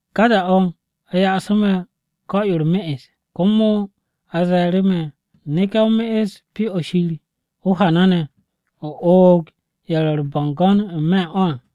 Ka da-o̱ a ya'asu̱ me̱ o-ko̱ yo u̱r-me'es, komo a ze̱e̱ru̱ me̱, “Neke̱ o me'es Pyo-o̱ Shir o-hana ne̱. O oog ye̱ ro̱ u̱r-bo̱ngo̱n n-me̱ u̱n o̱ à.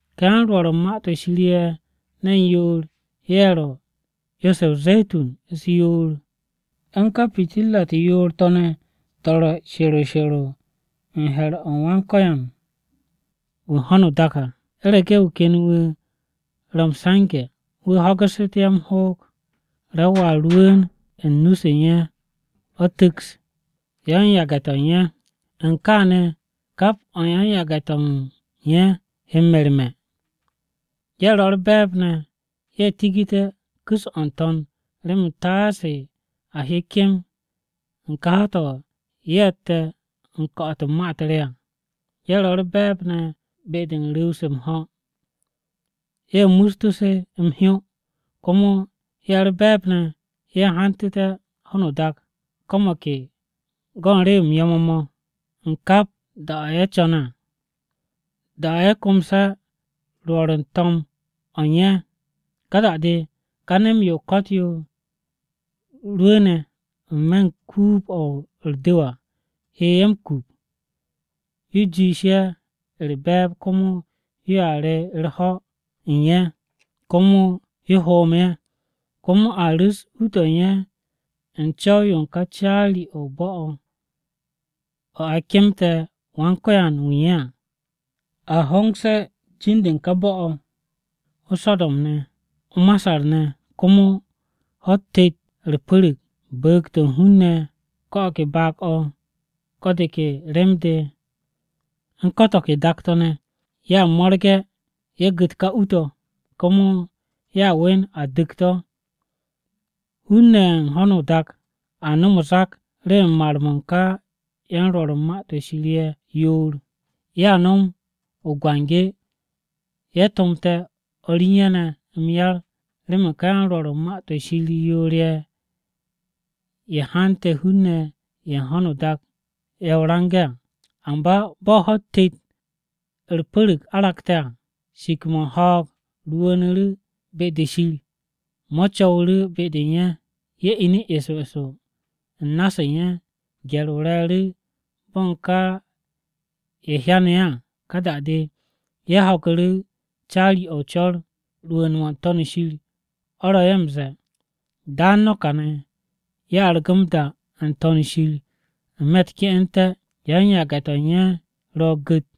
Ka yan-Rwo̱r u̱n Ma-to̱ Shir ye̱ ne̱n yoor-ye̱ ro̱ 'yo-se o-ze̱tun u̱s-yoor u̱n ka pitirra-u̱t yoor-to̱ ne̱ to̱ ro̱ she̱ro she̱ro u̱n he̱r-o Wan-Ko̱yan wu̱ u̱n ho̱no o-dak à. U̱rege̱ wu̱ ken wu̱ ro̱ m-se̱nge̱ wu̱ ho̱gu̱ssu̱té̱ ye̱ m-hoog, ra-o a rwu̱u̱n u̱n nu-se u̱n ye̱ o̱ tu̱ks yan-yage̱-to̱ u̱n ye̱. U̱n kaane̱, kap o̱ u̱n yan-yage̱-to̱ u̱n ye̱ he m-merme̱. Ye̱ ro̱ u̱r-be̱e̱b ne̱ ye̱ tigité̱ ku̱s-o̱ n-to̱n remen taase a hye kem u̱n ka ho̱-to̱ ye̱tte̱ u̱n ko̱'o̱t-o̱ u̱n ma-u̱t re à. Ye̱ ro̱ u̱r-be̱e̱b ne̱ be-de u̱n ru̱w-se m-ho̱, ye̱ mustu̱ se m-hyó; komo ye̱ u̱r-be̱e̱b ne̱ ye̱ hantu̱te̱ ho̱no o-dak ko̱ mo̱ ke go̱ u̱n rew-m yo̱-mo̱ mo̱ u̱n kap da-o̱ ye̱ co̱ne̱ à. Da-o̱ ye̱ komse̱ rwo̱r u̱n to̱m-o̱ u̱n ye̱ à, ka da-de ká nem-yo o-ko̱t yo rwu̱u̱ne̱ n-me̱ u̱n kuub-o̱ u̱r-du̱w à he ye̱ m-kup yo jiish ye̱ u̱r-be̱e̱b komo yoa re u̱r-ho̱ u̱n ye̱, komo yo hoom ye̱. Komo a ru̱s u-to̱ u̱n ye̱ u̱n co̱w-yo u̱n ka caari-o̱ o-bo̱ o̱ o̱ a kemte̱ Wan-Ko̱yan-wu̱ u̱n ye̱ à. A u̱n hongse̱ jin-de u̱n ka bo̱-o̱ o-So̱do̱m ne̱, o-Masar ne̱. Komo ho̱-u̱t tet u̱r-pu̱ru̱g bu̱u̱g-to̱ u̱n hun-ne̱, ko̱ o̱ ke baag-o̱, ko̱ de ke rem-de u̱n ko̱ to̱ ke dak-to̱ ne̱, ye̱a mo̱rge̱ ye̱ gu̱t ka u-to̱, komo ye̱ we̱n a du̱k to̱. Hun-ne̱ ye̱ u̱n ho̱no o-dak a nom o-zak remen mar-mo̱ u̱n ka yan-Rwo̱r u̱n Ma-to̱ Shir ye̱ yoor. Ye̱a nom o-biki, ye̱ tomte̱ o̱r u̱n ye̱ ne̱ m-yar remen ka yan-Rwo̱r u̱n Ma-to̱ Shir yoor-ye̱ ye̱ hante̱ ka hun-ne̱ ye̱ u̱n ho̱no o-dak ye̱ o-range̱ à. Amba bo̱ ka ho̱-u̱t tet-to̱ u̱r-pu̱ru̱g aragte̱ à, shik-mo̱ u̱n ho̱o̱g rwu̱u̱nu̱ be-de Shir mo̱ co̱wu̱ru̱ be-de u̱n ye̱. Ye̱ inu̱ eso eso u̱n na-se u̱n ye̱. Gye̱r-o re̱e̱ru̱ bo̱ u̱n ka ye̱ hyanu̱ ye̱ à. Ka da-de ye̱ ho̱gu̱ru̱ caari-o̱ o-co̱r rwu̱u̱n-mo̱ n-To̱n shir o̱ ro̱ ye̱ m-ze̱e̱, “Daan no̱ kane̱!” Ye̱ argu̱ m-da n-To̱n shir n-me̱ u̱t-ke'ente̱, yan-yage̱-to̱ u̱n ye̱ ro̱ gu̱t.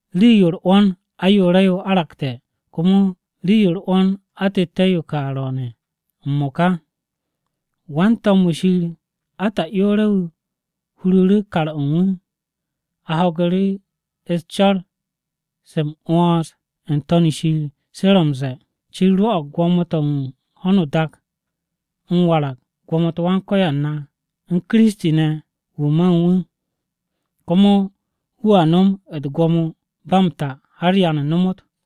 Rii-yo u̱r-'wo̱n ayoore̱-yo aragte̱, komo rii-yo u̱r-'wo̱n atette̱-yo ka ro̱o̱ne̱ m-mo̱ka. Wan-to̱m-wu̱ Shir ata'yoore̱-wu̱ huru̱ru̱ kar-o̱ u̱n wu̱, a ho̱gu̱ru̱ u̱s-co̱r se m-'wo̱ns n-To̱n shir se ro̱ m-ze̱e̱, “Shir rwo̱'o̱g gwo̱mo-to̱ u̱n ho̱no o-dak m-warag gwo̱mo-u̱t Wan-Ko̱yan na u̱n Kiristi wu̱ ma u̱n wu̱ ne̱. Komo wu̱a nom u̱t-gwo̱mo ba m-ta har ya nomot!”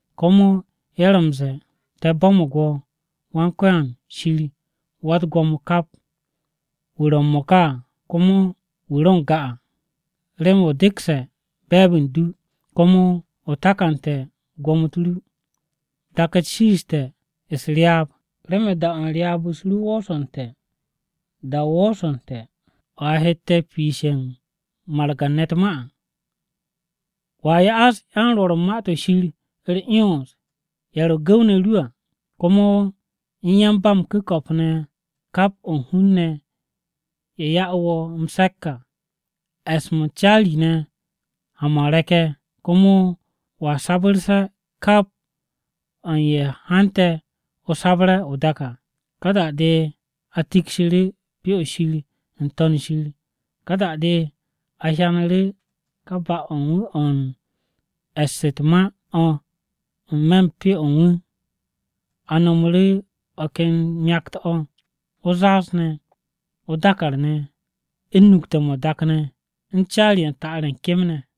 Komo ye̱ ro̱ m-ze̱e̱, “Te̱ bo̱mo̱g wo̱, Wan-Ko̱yan Shir Wa-u̱t-Gwo̱mo kap, wo̱ wu̱ ro̱ m-mo̱ka à, komo wo̱ wu̱ ro n-ga à, remen o dekse̱ be̱e̱b u̱n du, komo o takante̱ gwo̱mo-u̱t ru. Dak-u̱t shiiste̱ u̱s-ryaab, remen da-o̱ u̱n ryaab-u̱s ru woosu̱nte̱. Da-o woosu̱nte̱ o̱ a hette̱ piishe̱ u̱n margan-ne̱ u̱t-ma à, wo̱a ya'as yan-Rwo̱r u̱n ma-to̱ Shir u̱r-'yons ye̱ ro̱ gu̱w-ne̱ ru̱ à. Komo u̱n yan-ba-m-ku̱ko̱p ne̱ u̱n kap o̱ u̱n hun-ne̱ ne̱ ye̱ ya'u̱ wo̱ m-se̱k à, e̱s-mo̱ u̱n caari-ne̱ ha-mo̱ u̱n re̱k-ye̱. Komo wo̱a sabu̱rse̱ kap o̱ u̱n ye̱ hante̱ o̱ sabre̱ o-dak à!” Ka da-de a tikshu̱ru̱ Pyo-o̱ Shir n-To̱n shir. Ka da-o̱ a hyanu̱ru̱ kà ba-o̱ u̱n wu̱ o̱ u̱n e̱ss u̱t-ma o̱ n-me̱ u̱n Pyo-o̱ u̱n wu̱. A nomoru̱ o̱ ken myakt-o̱, o-zaaz ne̱, o-dàkàr ne̱, u̱n nukte̱-mo̱ o-dak ne̱, u̱n caari-ye̱ u̱n ta'ar-ye̱ u̱n kem ne̱.